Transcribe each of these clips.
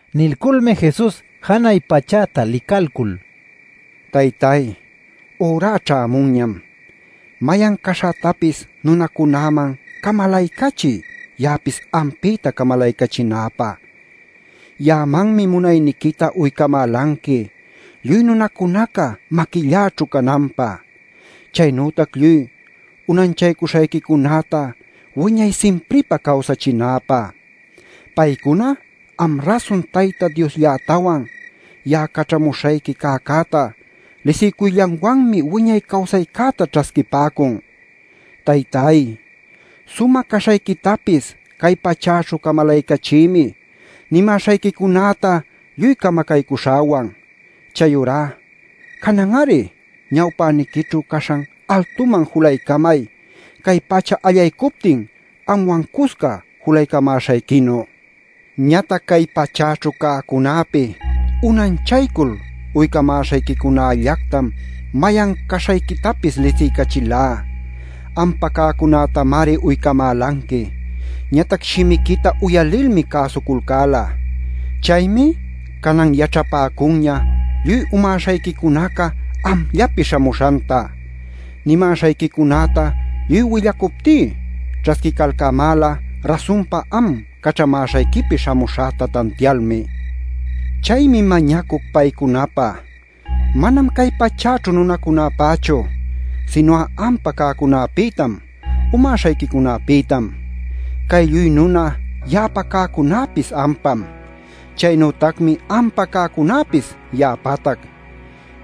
Nilculmi Jesus janay pachäta licalcul: “Taytay, ürá ćhämunñam. Mayan caśhätapis nunacunäman camalaycachiy ya'apis ampïta camalaycachinäpä. Ya'amanmi munayniquita uycamälanqui lluy nunacunaca maquilläćhu cananpä, chaynütac lluy unanchaycuśhayquicunäta wiñay simpripä cawsachinäpä. Paycuna am rasun Tayta Diosllätawan ya'a caćhamuśhayqui cäcäta lisiycuyllanwanmi wiñay cawsaycäta ćhasquipäcun. Taytay, sumä caśhayquitapis cay pachäćhu camalaycachïmi nimäśhayquicunäta lluy camacaycuśhäwan. Chayurá, canan-ari ñawpäniquićhu caśhan altuman julaycamay cay pacha allaycuptin anwan cusca julaycamäśhayquinu. “Ñatac cay pachäćhu cäcunäpi unanchaycul uycamäśhayquicunällactam mayan caśhayquitapis lisiycachilá. Ampa cäcunätamari uycamälanqui. Ñatac shimiquita uyalilmi cäsuculcäla. Chaymi canan yaćhapäcunña lluy umäśhayquicunaca amllapi śhamuśhanta. Nimäśhayquicunäta lluy willacuptí ćhasquicalcämäla rasunpa am caćhamäśhayquipi śhamuśhäta tantialmi. Chaymi mañacuc paycunapä. Manam cay pachäćhu nunacunäpächu, sinu'a ampa cäcunapïtam, umäśhayquicunapïtam. Cay lluy nuna ya'apa cäcunäpis ampam. Chaynütacmi ampa cäcunapis ya'apatac.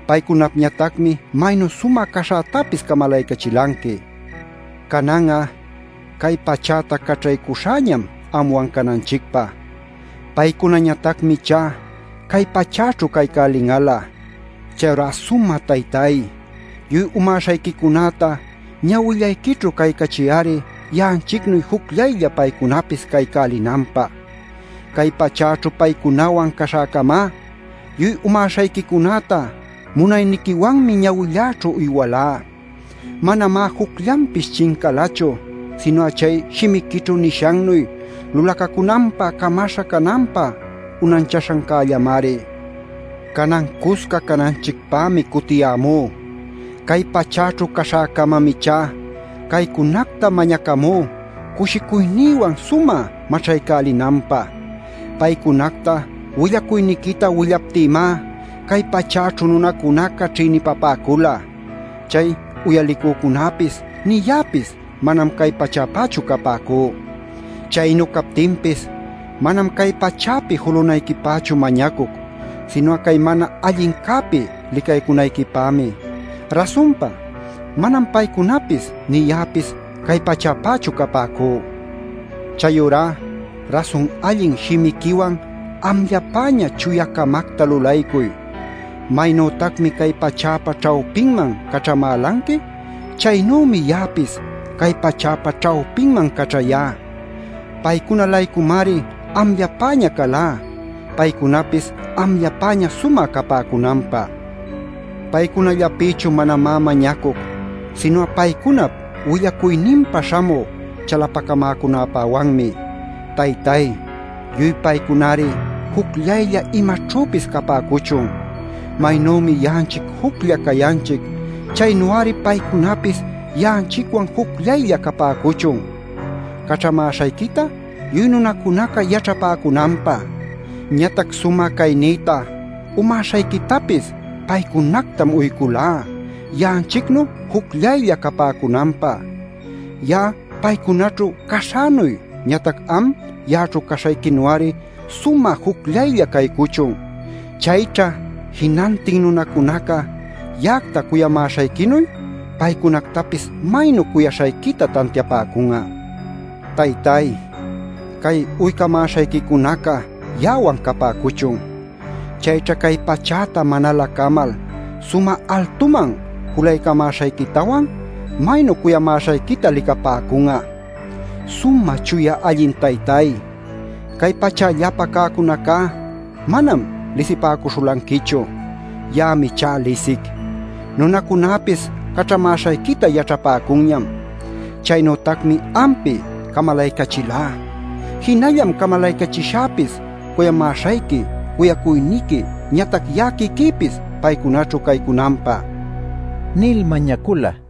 Paycunapñatacmi maynu sumä caśhätapis camalaycachilanqui. “Canan'a cay pachäta caćhaycuśhäñam anwan cananchicpä. Paycunañatacmi ichá cay pachäćhu caycälin'alä. Chayurá Sumä Taytay, lluy umäśhayquicunäta ñawillayquićhu caycachiy-ari ya'anchicnuy jucllaylla paycunapis caycälinanpä. Cay pachäćhu paycunawan caśhäcamá, lluy umäśhayquicunäta munayniquiwanmi ñawilläćhu uywalá. Manamá jucllanpis chincalachu sinu'a chay shimiquićhu nishannuy lulacacunanpä camacäśha cananpä unanchäśhancällamari. “Canan cusca cananchicpämi cutiyämú. Cay pachäćhu caśhäcamam ichá caycunacta mañacamú cushicuynïwan sumä maćhaycälinanpä. Paycunacta willacuyniquita willaptïmá cay pachäćhu nunacunaca ćhïnipapäcula. Chay uyalicücunäpis nï ya'apis manam cay pachäpächu capäcú. Chaynu captinpis, manam cay pachäpi julunayquipächu mañacuc, sinu'a cay mana allincäpi licaycunayquipämi. Rasunpa, manam paycunapis nï ya'apis cay pachäpächu capäcú. Chayurá rasun allin shimiquiwan amllapäña chuya-camacta lulaycuy. Maynütacmi cay pachäpa ćhawpinman caćhamälanqui, chaynümi ya'apis cay pachäpa ćhawpinman caćhayá. Paycuna-laycumari amllapäña calá paycunapis amllapäña sumä capäcunanpä. “Paycunallapïchu manamá mañacuc, sinu'a paycunap willacuyninpa śhamü chalapacamäcunäpäwanmi. Taytay, lluy paycunari jucllaylla imaćhüpis capäcuchun. Maynümi ya'anchic juclla cayanchic, chaynu-ari paycunapis ya'anchicwan jucllaylla capäcuchun, caćhamäśhayquita lluy nunacunaca yaćhapäcunanpä. Ñatac sumä caynïta umäśhayquitapis paycunactam uyculá ya'anchicnu jucllaylla capäcunanpä. Ya'a paycunaćhu caśhänuy ñatac am ya'aćhu caśhayquinu-ari sumä jucllaylla caycuchun. Chayćha jinantin nunacunaca ya'acta cuyamäśhayquinuy paycunactapis maynu cuyaśhayquita tantiapäcun'a. “Taytay, cay uycamäśhayquicunaca ya'awan capäcuchun. Chayćha cay pachäta manalä camal sumä altuman julaycamäśhayquitawan maynu cuyamäśhayquita licapäcun'a. Sumä Chuya Allin Taytáy, cay pachällapa cäcunacá manam lisipäcuśhulanquichu. Ya'ami ichá lisic. Nunäcunapis caćhamäśhayquita yaćhapäcunñam. Chaynütacmi ampi camalaycachilá; jinallam camalaycachishäpis cuyamäśhayqui cuyacuyniqui ñatac ya'a quiquïpis paycunaćhu caycunanpä” nil mañacula.